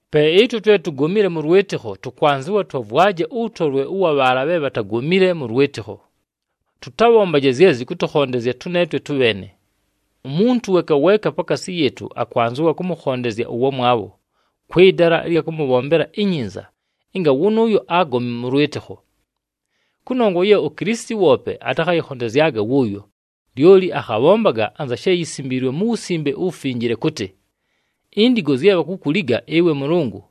Pe ɨtwe twe tugomile mʉ lwɨtɨkho, tʉkwanzɨwa twavwaje ʉwʉtolwe ʉwa bhaala bhe bhatagomile mʉ lwɨtɨkho. Tʉtabhombaje zye zɨkʉtʉkhondezya tʉneetwe tʉbheene. Umuntu weeka weeka pakaasi yɨɨtʉ, akwanzɨwa kʉmʉkhondezya ʉwamwabho, kwɨ dala ɨlya kʉmʉbhombela inyinza ɨnga wʉnʉʉyo agome mʉ lwɨtɨkho. Kʉnongwa ye uKilisiti woope atakhayɨkhondezyaga wʉʉyo, lyoli akhabhombaga anza she yisimbiilwe mu Wusimbe uWufinjile kʉtɨ, “Indigo zye bhakukuliga ɨwe Mʉlʉngʉ,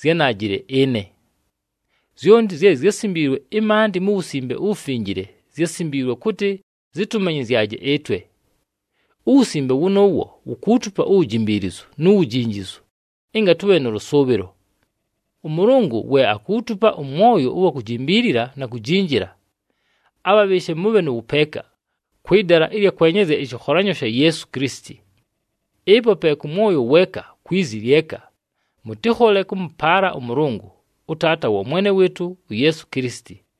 zyánaajile ɨne.” Zyonti zye zyásimbiilwe ɨmaandɨ mu Wusimbe uWufinjile, zyásimbiilwe kʉtɨ zɨtʉmanyɨzyaje ɨtwe. Uwusimbe wʉnʉʉwo wukuutupa uwujimbiilizu nu wujinjizu, ɨnga tʉbhe nʉ lʉsʉʉbhɨlo. ɄMʉlʉngʉ we akuutupa ʉmwoyo ʉwa kujimbiilila na kujinjila, abhabhɨɨshe mʉbhe nʉ wʉpeeka, kwɨ dala ɨlya kwenyezya ɨshɨkholanyo sha Yeesu Kilisiti. Ɨpo pe kʉ mwoyo weeka na kwi zi lyeka, mʉtɨkhole kʉmʉpaala ʉMʉlʉngʉ, ʉTaata wa Mwene wɨɨtʉ uYeesu Kilisiti.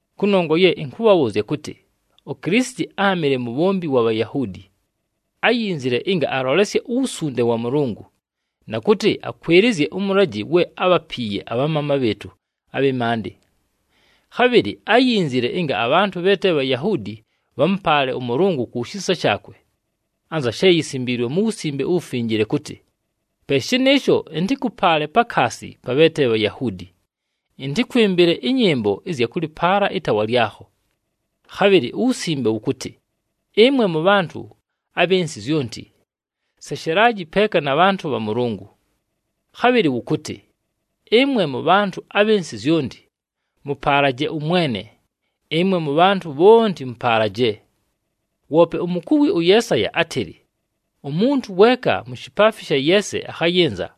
Kʉnongwa ye ɨnkʉbhabhʉʉzya kʉtɨ, uKilisiti áamɨle mubhombi wa Bhayahuudi. Áyinzile ɨnga alolesye uwusunde wa Mʉlʉngʉ, na kʉtɨ akwɨlɨzye ʉmʉlajɨ we ábhapiiye abhamaama bhɨɨtʉ abhɨ maandɨ. Khabhɨlɨ áyinzile ɨnga abhantʉ bhe te Bhayahuudi bhamʉpaale ʉMʉlʉngʉ ku shisa shaakwe. Anza she yisimbiilwe mu Wusimbe uWufinjile kʉtɨ, “Pe shɨnɨɨsho, ɨntɨkʉpaale pakaasi pa bhe te Bhayahuudi, ɨntɨkwɨmbɨle ɨnyɨmbo ɨzya kʉlɨpaala ɨtaawa lyakho.” Khabhɨlɨ uWusimbe wʉkʉtɨ, “Ɨmwe mʉbhantʉ abhɨ nsɨ zyonti, seshelaji peeka na bhantʉ bha Mʉlʉngʉ.” Khabhɨlɨ wʉkʉtɨ, “Ɨmwe mʉbhantʉ abhɨ nsɨ zyonti, mʉpaalaje ʉMwene. Ɨmwe mʉbhantʉ bhonti mʉpaalaje!” Woope umukuwi ʉYeesaya átɨlɨ, “Umuntu weeka mu shipaafi sha Yeese akhayɨnza,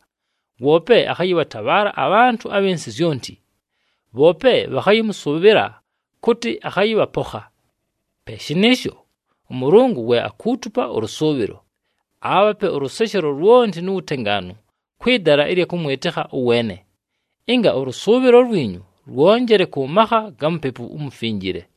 woope akhayɨbhatabhaala abhantʉ abhɨ nsɨ zyonti, bhoope bhakhayɨmʉsʉʉbhɨla kʉtɨ akhayɨbhapokha.” Pe shɨnɨɨsho, ʉMʉlʉngʉ we akuutupa ʉlʉsʉʉbhɨlo, aabhape ʉlʉseshelo lwonti nu wutengaanu kwɨ dala ɨlya kʉmwɨtɨkha ʉweene, ɨnga ʉlʉsʉʉbhɨlo lwinyu lwonjele kʉ makha ga Mupepu uMufinjile.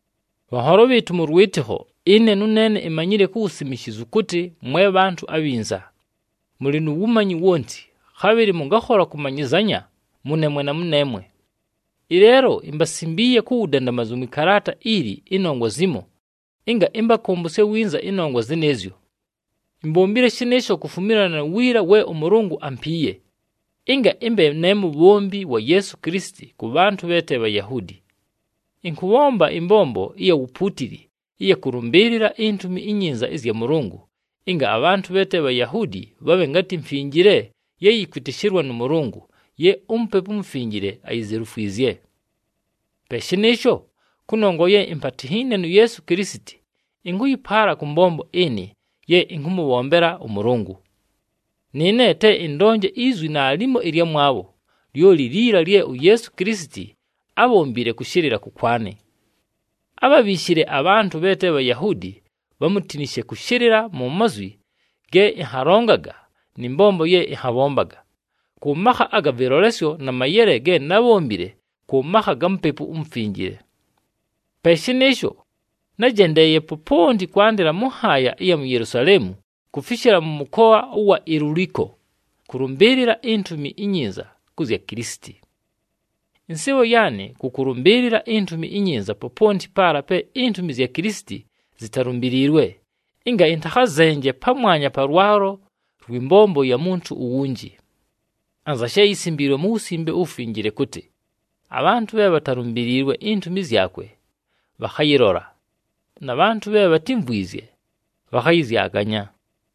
Bhanholo bhɨɨtʉ mʉ lwɨtɨkho, ɨne nʉneene imanyile ku wusimishizu kʉtɨ mwe bhantʉ abhinza, mʉlɨ nu wumanyi wonti, khabhɨlɨ mʉngakhola kʉmanyɨzanya mʉneemwe na mʉneemwe. Ɨleelo imbasimbiiye ku wudandamazu mwɨ kalaata ili ɨnongwa zimo, ɨnga ɨmbakʉmbʉsye winza ɨnongwa zɨnɨɨzyo. Imbombile shɨnɨɨsho kufumilana nu wiila we ʉMʉlʉngʉ ampiiye, ɨnga ɨmbe ne mubhombi wa Yeesu Kilisiti kʉ bhantʉ bhe te Bhayahuudi. Ɨnkʉbhomba ɨmbombo ɨya wupuutili ɨya kʉlʉmbɨɨlɨla iNtumi iNyinza ɨzya Mʉlʉngʉ, ɨnga abhantʉ bhe te Bhayahuudi bhabhe ngatɨ mfinjile ye yɨkwɨtɨshɨlwa nʉ Mʉlʉngʉ, ye uMupepu uMufinjile ayizelufwizye. Pe shɨnɨɨsho, kʉnongwa ye impatinhiine nu Yeesu Kilisiti, ɨnkʉyɨpaala kʉ mbombo ɨnɨ ye ɨnkʉmʉbhombela ʉMʉlʉngʉ. Nɨɨne te ɨndonje izwi naalimo ɨlyamwabho, lyoli liila lye uYeesu Kilisiti ábhombile kʉshɨlɨla kʉkwanɨ. Ábhabhiishile abhantʉ bhe te Bhayahuudi bhamutinishe kʉshɨlɨla mu mazwi ge ɨnhalongaga nɨ mbombo ye ɨnhabhombaga, kʉ makha aga vɨlolesyo na mayele ge nábhombile kʉ makha ga Mupepu uMufinjile. Pe shɨnɨɨsho, nájendeeye poponti kwandɨla mʉ nhaaya ɨya Yelusaleemu kufishila mʉ mʉkoa ʉwa Iluliko kʉlʉmbɨɨlɨla iNtumi iNyinza kʉ zya Kilisiti. Ɨnsɨɨbho yaanɨ kʉ kʉlʉmbɨɨlɨla iNtumi iNyinza poponti paala pe intumi zya Kilisiti zitalumbiliilwe, ɨnga ɨntakhazenje pamwanya pa lwalo lwɨ mbombo ya muntu uwunji. Anza she yisimbiilwe mu Wusimbe uWufinjile kʉtɨ, “Abhantʉ bhe bhatalumbiliilwe intumi zyakwe, bhakhayɨlola, na bhantʉ bhe bhatímvwizye, bhakhayɨzyaganya.”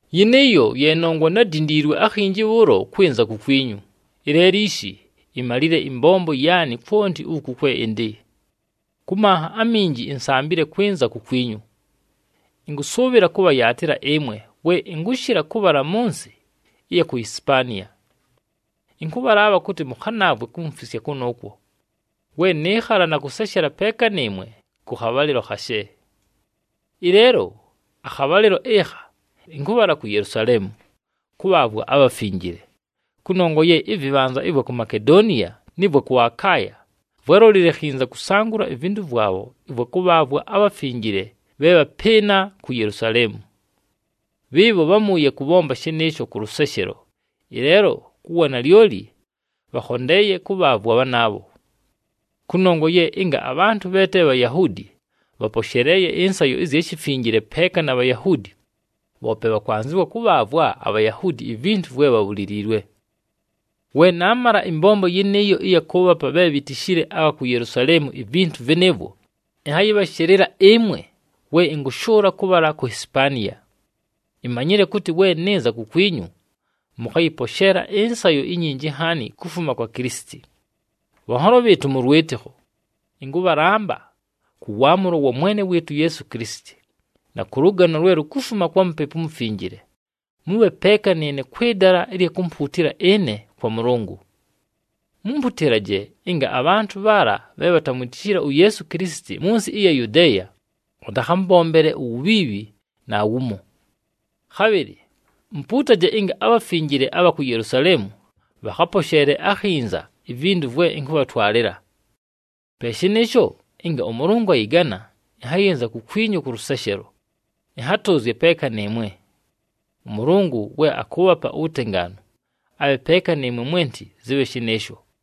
Yɨnɨɨyo ye nongwa nádindiilwe akhinji bhʉʉlo kwɨnza kukwinyu. Ɨleelo ishi, imalile ɨmbombo yaanɨ kwonti uku kwe ɨndɨ. Kʉ manha aminji, insambile kwɨnza kukwinyu. Ɨnkʉsʉʉbhɨla kʉbhayaatɨla ɨmwe we ɨnkʉshɨla kʉbhala mʉ nsɨ ɨya ku Hisipaniya. Ɨnkʉbhalaabha kʉtɨ mʉkhanaavwe kumfisya kʉnʉʉkwo, we nɨɨkhala na kʉseshela peeka nɨɨmwe kʉ khabhalɨlo khashe. Ɨleelo akhabhalɨlo ɨkha ɨnkʉbhala ku Yelusaleemu kʉbhaavwa abhafinjile. Kʉnongwa ye ɨvɨbhanza ɨvwa ku Makedoniya nɨ vwa kʉ Akaaya vwálolile khinza kʉsangʉla ivintu vwabho ɨvwa kʉbhaavwa abhafinjile bhe bhapɨɨna ku Yelusaleemu. Bhɨɨbho bhámʉʉye kʉbhomba shɨnɨɨsho kʉ lʉseshelo, ɨleelo ku wanalyoli, bhakhondeeye kʉbhaavwa bhanaabho. Kʉnongwa ye ɨnga abhantʉ bhe te Bhayahuudi, bhaposheleeye ɨnsayo ɨzya shifinjile peeka na Bhayahuudi, bhoope bhakwanzɨwa kʉbhaavwa aBhayahuudi ivintu vwe bhabhuliliilwe. We naamala ɨmbombo yɨnɨɨyo ɨya kʉʉbhapa bhe bhitishile abha ku Yelusaleemu ivintu vɨnɨɨvwo, ɨnhayɨbhashɨlɨla ɨmwe we ɨnkʉshʉʉla kʉbhala ku Hisipaniya. Imanyile kʉtɨ, we nɨnza kukwinyu, mʉkhayɨposheela ɨnsayo inyinji nhaani kufuma kwa Kilisiti. Bhanholo bhɨɨtʉ mʉ lwɨtɨkho, ɨnkʉbhalamba kʉ waamʉlo wa Mwene wɨɨtʉ uYeesu Kilisiti, na kʉ lʉgano lwe lukufuma kwa Mupepu uMufinjile, mʉbhe peeka nɨɨne kwɨ dala ɨlya kumpuutila ɨne kwa Mʉlʉngʉ. Mumputilaje ɨnga abhantʉ bhaala bhe bhatamwitishile uYeesu Kilisiti mʉ nsɨ ɨya Yudeeya, bhatakhambombele uwubhiibhi naawumo. Khabhɨlɨ mupuutaje ɨnga abhafinjile abha ku Yelusaleemu bhakhaposheele akhinza ivintu vwe ɨnkʉbhatwalɨla. Pe shɨnɨɨsho, ɨnga ʉMʉlʉngʉ ayɨgana, ɨnhayɨnza kukwinyu kʉ lʉseshelo, ɨnhatʉʉzye peeka nɨɨmwe. ɄMʉlʉngʉ we akʉʉbhapa uwutengaanu, abhe peeka nɨɨmwe mwenti. Zɨbhe shɨnɨɨsho!